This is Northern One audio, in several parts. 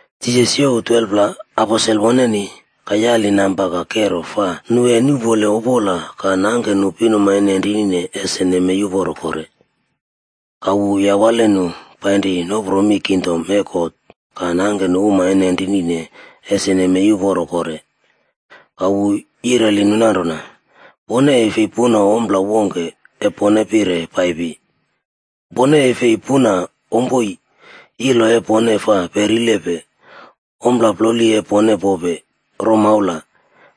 Jisas youw 12pla aposel woneni, ka yali namba ka kero fa nu e nuꞌpole opola ka nangke nu pinuma e nenrinine ese nemei uporo kore. Ka wu yawale nu painri nopro mi kingdom e God ka nangke nu uma e nenrinine ese nemei uporo kore. Ka wu yireli nu nanrona, “Pone e fi puna ompla wongke e pone pire paipi. Pone e fi puna ompoi, ilo e pone fa perilepe, ommo ploli e pone pope, romaula,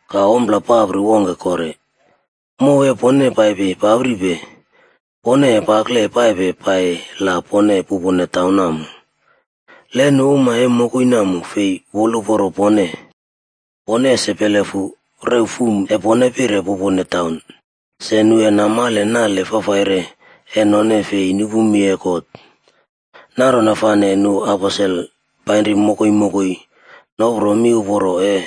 ka ompla papri wongke kore. Mow e pone paipi papripe, pone e pakle paipe pai la pone pupone taun namo. Le nu uma e mokoi namo fei woluporo pone, pone ese pelefu rew fum e pone, e pone pire pupone taun, se nu e namale nale fafaire e none fi nupu mi e God.” Nanrona fane nu aposel painri mokoi mokoi nopro miuporo e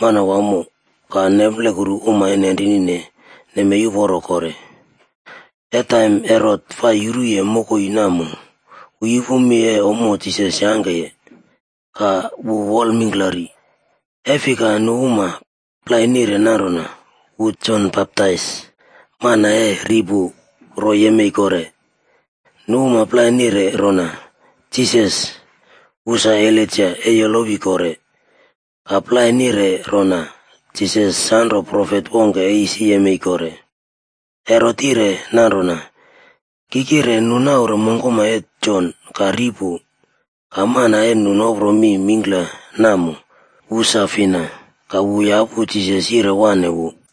Manawamo ka nemplekurune uma e nenrinine nemei uporo kore. E taim Herot fa yuruye mokoi namo, wu yupu mi e ommo Jisas yangkeye, ka wu wol mingklari, e fika nu uma plai nire nanrona wu Jon Baptais mana e ri pu ro yemei kore. Nu uma plai nire rona, Jisas, wu sa Elaija e yolowi kore, ka plai nire rona Jisas sanro profet wongke e isi yemei kore. Herot yire nanrona, “Ki kire nu naure mongkoma e Jon ka ri pu, ka mana e nu nopro mi mingkla namo, wu sa fina?” Ka wu yapu Jisas yire wane wu.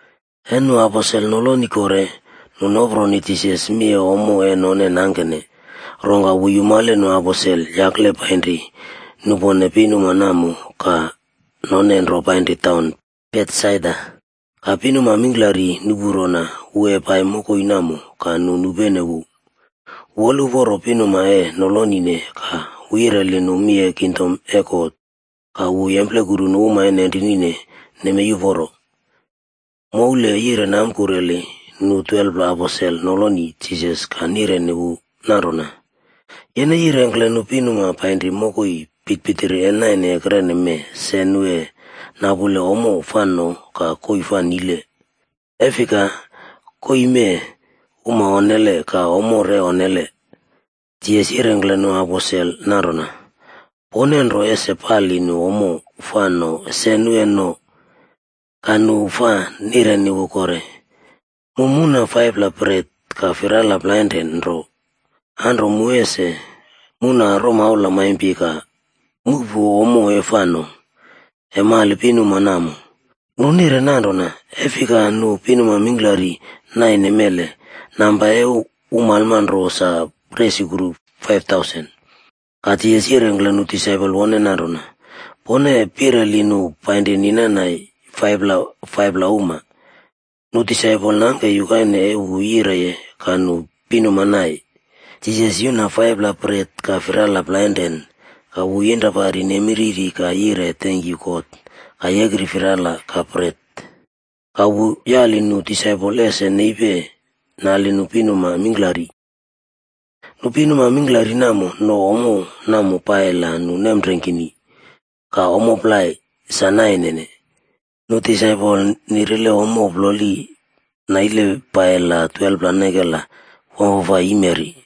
E nu aposel noloni kore, nu noproni Jisas mi e ommo e none nangkene. Rongka wu yumale nu aposel yakle painri nupone pinuma namo ka none nro painri taun Betsaida. Ka pinuma mingklari nupu rona wu e pai mokoi namo ka nu nupene wu. Wu woluporo pinuma e nolonine ka wu yireli nu mi e kingdom e God ka wu yemplekuru nu uma e nenrinine nemei uporo. Moule yire namkureli nu 12pla aposel noloni Jisas ka nireni wu nanrona, “Yene yirengkle nu pinuma painri mokoi pitirpitiri e naine ekrene mee se nu e napule ommo fa no ka koii fa nile. E fika, koii mee uma onnele ka ommo re onnele.” Jisas yirengkle nu aposel nanrona, “Pone nro ese pali nu ommo fa no se nu e no.” Ka nu fa nireni wu kore, “Mu muna 5pla bret ka firala plainrane nro. Anro mu ese muna romaula maimpi ka muꞌpu ommo e fa no, e mali pinuma namo.” Nu nire nanrona, e fika nu pinuma mingklari naine mele, namba e umalma ro sa resukru 5,000.a Ka Jisas yirengkle nu disaipol woneni nanrona, “Pone pireli nu painri ninan nai 5-pla 5-pla uma.” Nu disaipol nangke yukaine e wu yireniye ka nu pinuma naine. Jisas yuna 5pla bret ka firala plainrane ka wu yinrapari nemi riri ka yire tenkyu God ka yekri firala ka bret. Ka wu yaliye nu disaipol ese nepi nali nu pinuma mingklari. Nu pinuma mingklari namo no ommo namo pai la nu nemreingkini ka ommo plai sa naine. Nu disaipol nirile ommo ploli naile pai la 12pla nekela wamfafai yimeri.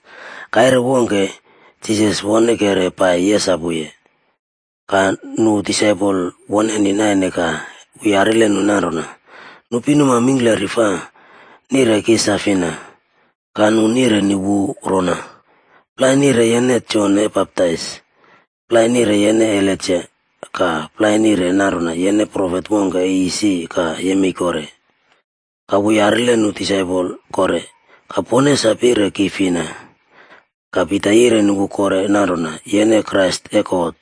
Kaire wongke, Jisas wonekere pai yesapuye. Ka nu disaipol woneni naine ka wu yarile nu nanrona, “Nu pinuma mingklari fa nirene ki sa fina?” Ka nu nireni wu rona, “Plai nire yene Jon e Baptais, plai nire yene Elaija, ka plai nire nanrona yene profet wongke e isi ka yemei kore.” Ka wu yarile nu disaipol kore, “Ka pone sa pire ki fina?” Ka Pita yireni wu kore nanrona, “Yene Krais e God.”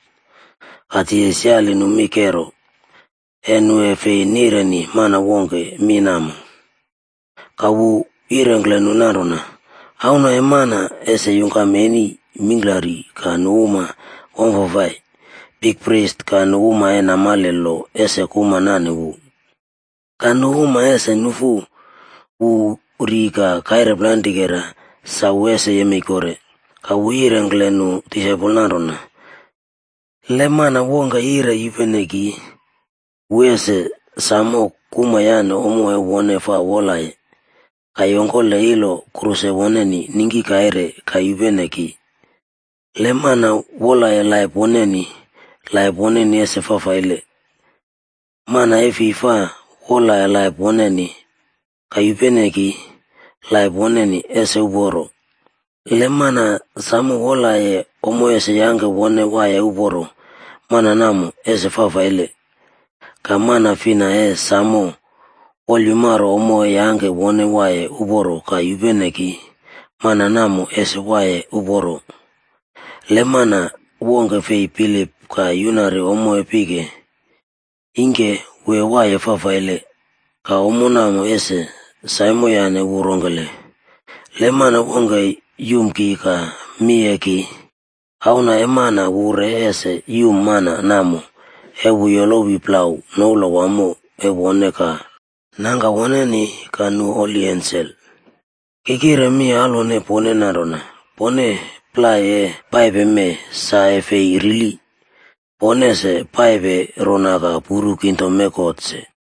Ka Jisas yire nu mi kero, e nu e fi nireni mana wongke mi namo. Ka wu yirengkle nu nanrona, “Auna e Mana ese yungkam eni mingklari ka nu uma wamfafai, bikpris ka nu uma e namale lo ese kuma nane wu. Ka nu uma ese nufu wu ri ka kaire plainrikera sa wu ese yemei kore.” Ka wu yirengkle nu disaipol nanrona, “Le mana wongke yire yupene ki, wu ese samo kuma yane ommo e wone fa wolaye, ka yongkole ilo kruse woneni ningki kaire ka yupene ki. Le mana wolaye laip woneni, laip woneni ese fafaile. Mana e fi fa wolaye laip woneni, ka yupene ki, laip woneni ese uporo. Le mana samo wolaye ommo ese yangke wone waiye uporo, mana namo ese fafaile. Ka mana fina e samo wolyumaro ommo e yangke wone waiye uporo ka yupene ki, mana namo ese waiye uporo. Le mana wongke fei bilip ka yunari ommo e pike, ingke wu e waiye fafaile, ka ommo namo ese saimoyane wu rongkele? Le mana wongke yum ki ka mi e ki, Auna e Mana wu re ese yum mana namo e wu yolowi plau noula wamo e wone ka Nangka woneni ka nu holi ensel. Ki kire mi alwone pone nanrona, pone plai e paipe mee sa e fei rili, pone ese paipe rona ka puru kingdom e God se.”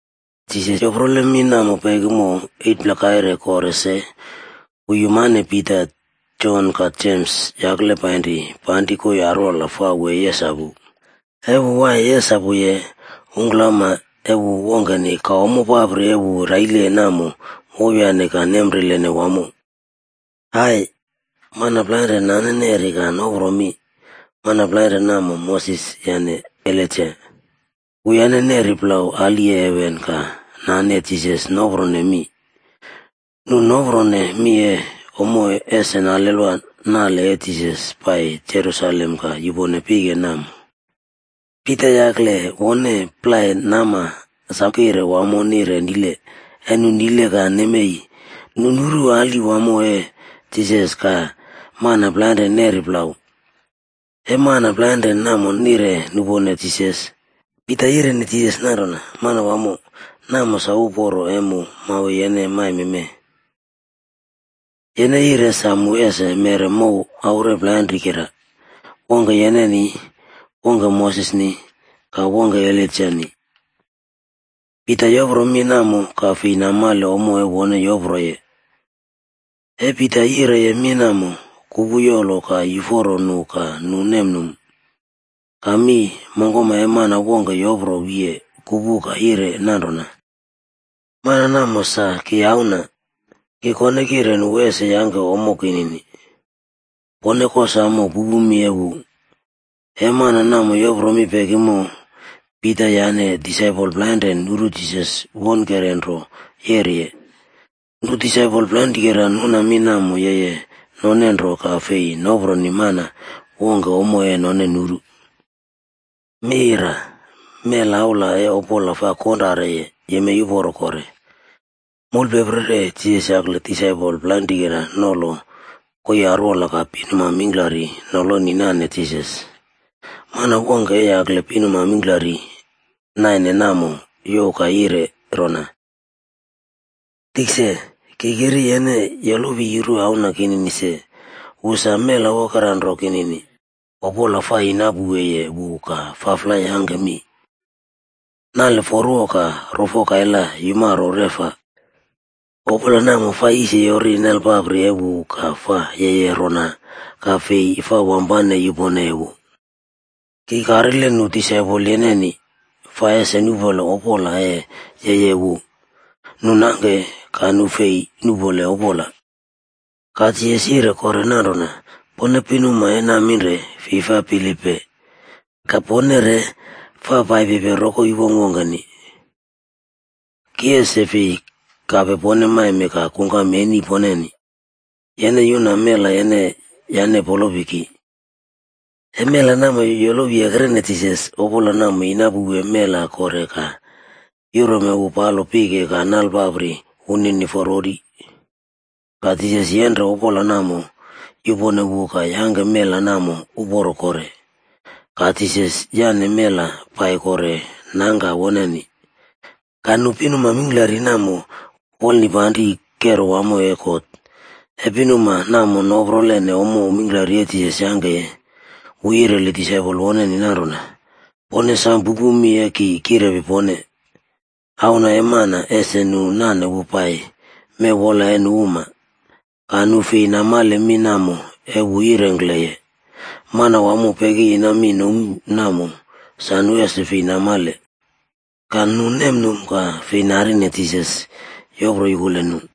Jisas yoprole mi namo pekimo, 8pla kaire kore se, wu yumane Pita, Jon ka Jems yakle painri panri koii arwola fa wu e yesapu. E wu waiye yesapuye, ungklama e wu wongkeni ka ommo papri e wu raileye namo wowyane ka nemrilene wamo. Ai! Mana plainren nane neri ka nopro mi. Mana plainren namo, Moses yane Elaija. Wuyane neri plau ali e heven ka nane Jisas noprone mi. Nu noprone mi e ommo ese nalelwa nale e Jisas pai Jerusalem ka yupone pike namo. Pita yakle wone plai nama sam kire wamo nire nile, e nu nile ka nemei, nu nuru ali wamo e Jisas ka mana plainre neri plau. E mana plainren namo nire nupone Jisas, Pita yireni Jisas nanrona, “Manwamo, namo sa uporo e mu mawe yene maime mee. Yene yire sa mu ese meꞌre mow aure plainrikera, wongke yeneni, wongke Mosesni ka wongke Elaijani.” Pita yopro mi namo ka fei namale ommo e wone yoproye. E Pita yireye mi namo, kupu yolo ka yuforo nu ka nu nemnum. Ka mi mongkoma e mana wongke yopro wiye kupu ka yire nanrona, “Mana namo sa ki Auna, ki kone kireni wu ese yangke ommo kinini. Pone kosamo pupu mi e wu.” E mana namo yopro mi pekimo, Pita yane disaipol plainren nuru Jisas wonekere nro yeriye. Nu disaipol plainrikera nuna mi namo yeye none nro ka fei noproni mana wongke ommo e none nuru. Melaula e opola fa konrareye, yemei uporo kore. Moulpeprere Jisas yakle disaipol plainrikera nolo koii arwola ka pinuma mingklari noloni nane Jisas. Mana wongke e yakle pinuma mingklari naine namo youw ka yire rona, “Tikse, ki kiri yene yolowi yuru auna kinini se, wu sa mela wokeranro kinini. Opola fa yinapouweye wu ka faflai yangke mi, nale forwo ka rofo kaila yumaro reꞌfa. Opola namo fa yisiyori nalpapri e wu ka fa yeye rona ka fi fa wampane yuponeye wu. Ki karile nu disaipol yeneni, fa ese nuꞌpole opola e yeyeye wu, nu nangke ka nu fei nuꞌpole opola.” Ka Jisas yire kore nanrona, “Pone pinuma e naminre fi fa bilipne, ka pone re fa paipipe rokoi wongkwongkeni. Ki ese fi kape pone maime ka kungkam eni poneni. Yene yuna mela yeneni yane polopi ki.” E mela namo yolowiye Jisas, opola namo yinapouwe mela kore ka yurome wu palo pike ka nale papri woneni forwori. Ka Jisas yenre opola namo yupone wu ka yangke mela namo uporo kore. Ka Jisas yaꞌne mela pai kore nangka woneni. Ka nu pinuma mingklari namo wolnipanri kero wamo e God. E pinuma namo noprolene ommo mingklari e Jisas yangkeye, wu yireli disaipol woneni nanrona, “Pone sam pupu mi ese ki kirepi pone: Auna e Mana ese nu nane wu pai mew wola e nu uma.” Ka nu fei namale mi namo e wu yirengkleye. Manawamo pekiyina mi nomu namo sa nu ese fei namale. Ka nu nemnum ka fei narine Jisas yopro yukule nu.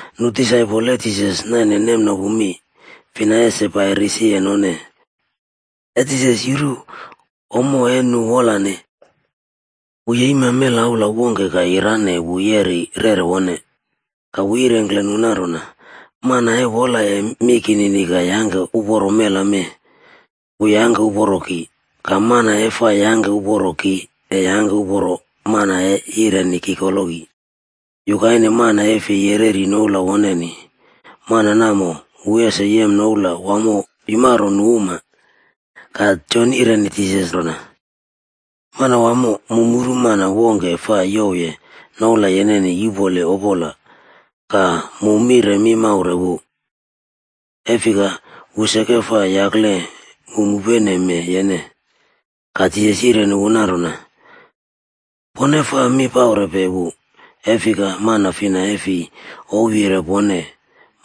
Nu disaipol e Jisas naine nemnopu mi, fina ese pai risiye none. E Jisas yuru ommo e nu wolane, wu yeima melaula wongke ka yirane wu yeri rere wone. Ka wu yirengkle nu nanrona, “Mana e wolaye mi kinini ka yangke uporo mela mee, wu yangke uporo ki. Ka mana e fa yangke uporo ki e yangke uporo mana e yireni ki koloki. Yukaine mana e fi yereri noula woneni, mana namo, wu ese yem noula wamo yumaro nu uma.” Ka Jon yireni Jisas rona, “Manawamo, mu muru mana wongke fa youwye noula yeneni yuꞌpole opola ka mu mire mi maure wu, e fika wu seke fa yakle mu mupeneme yene.” Ka Jisas yireni wu nanrona, “Pone fa mi paurepe wu, e fika mana fina e fi ouwyire pone,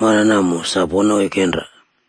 mana namo sa pone oikenra.”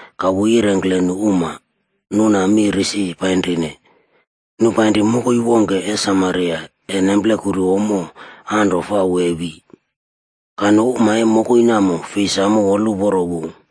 Ka wu yirengkle nu uma nuna mi risi painrine. Nu painri mokoi wongke e Samaria e nemplekuru ommo anro fa wu e wi. Ka nu uma e mokoi namo fi samo woluporo wu,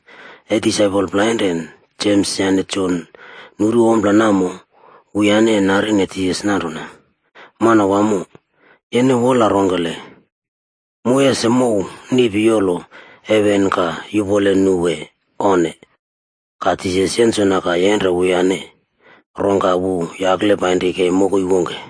E disaipol plainrane Jems yane Jon nuru ompla namo, wuyane narine Jisas nanrona, “Manawamo, yene wola rongkele, mu ese mouw niꞌpi yolo heven ka yuꞌpole nu wee, onne?” Ka Jisas yensona ka yenre wuyane, rongka wu yakle painri kei mokoi wongke.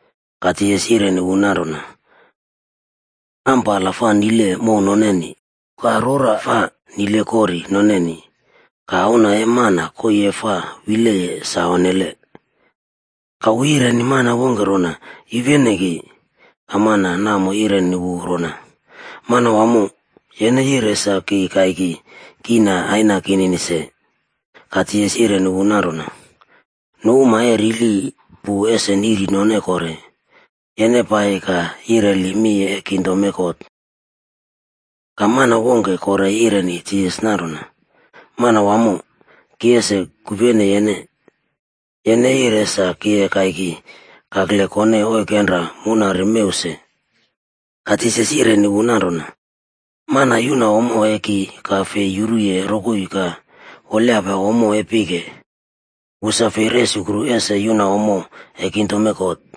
Ka Jisas yireni wu nanrona, “Ampala fa nile mow noneni, ka rora fa nile kori noneni, ka Auna e Mana koii e fa wileye sa onnele.” Ka wu yireni mana wongke rona, “Yupene ki.” Ka mana namo yireni wu rona, “Manawamo, yene yire sa ki kaiki kiꞌna aina kinini se.” Ka Jisas yireni wu nanrona, “Nu uma e rili pu ese niꞌri none kore, yene pai ka yireli mi e kingdom e God.” Ka mana wongke kore yireni Jisas nanrona, “Manawamo, ki ese kupene yene. Yene yire sa ki e kaiki kakle kone oikenra munari mew se.” Ka Jisas yireni wu nanrona, “Mana yuna ommo e ki ka fei yuruye rokoi ka wolyapa ommo e pike, wu sa fei resukru ese yuna ommo e kingdom e God.”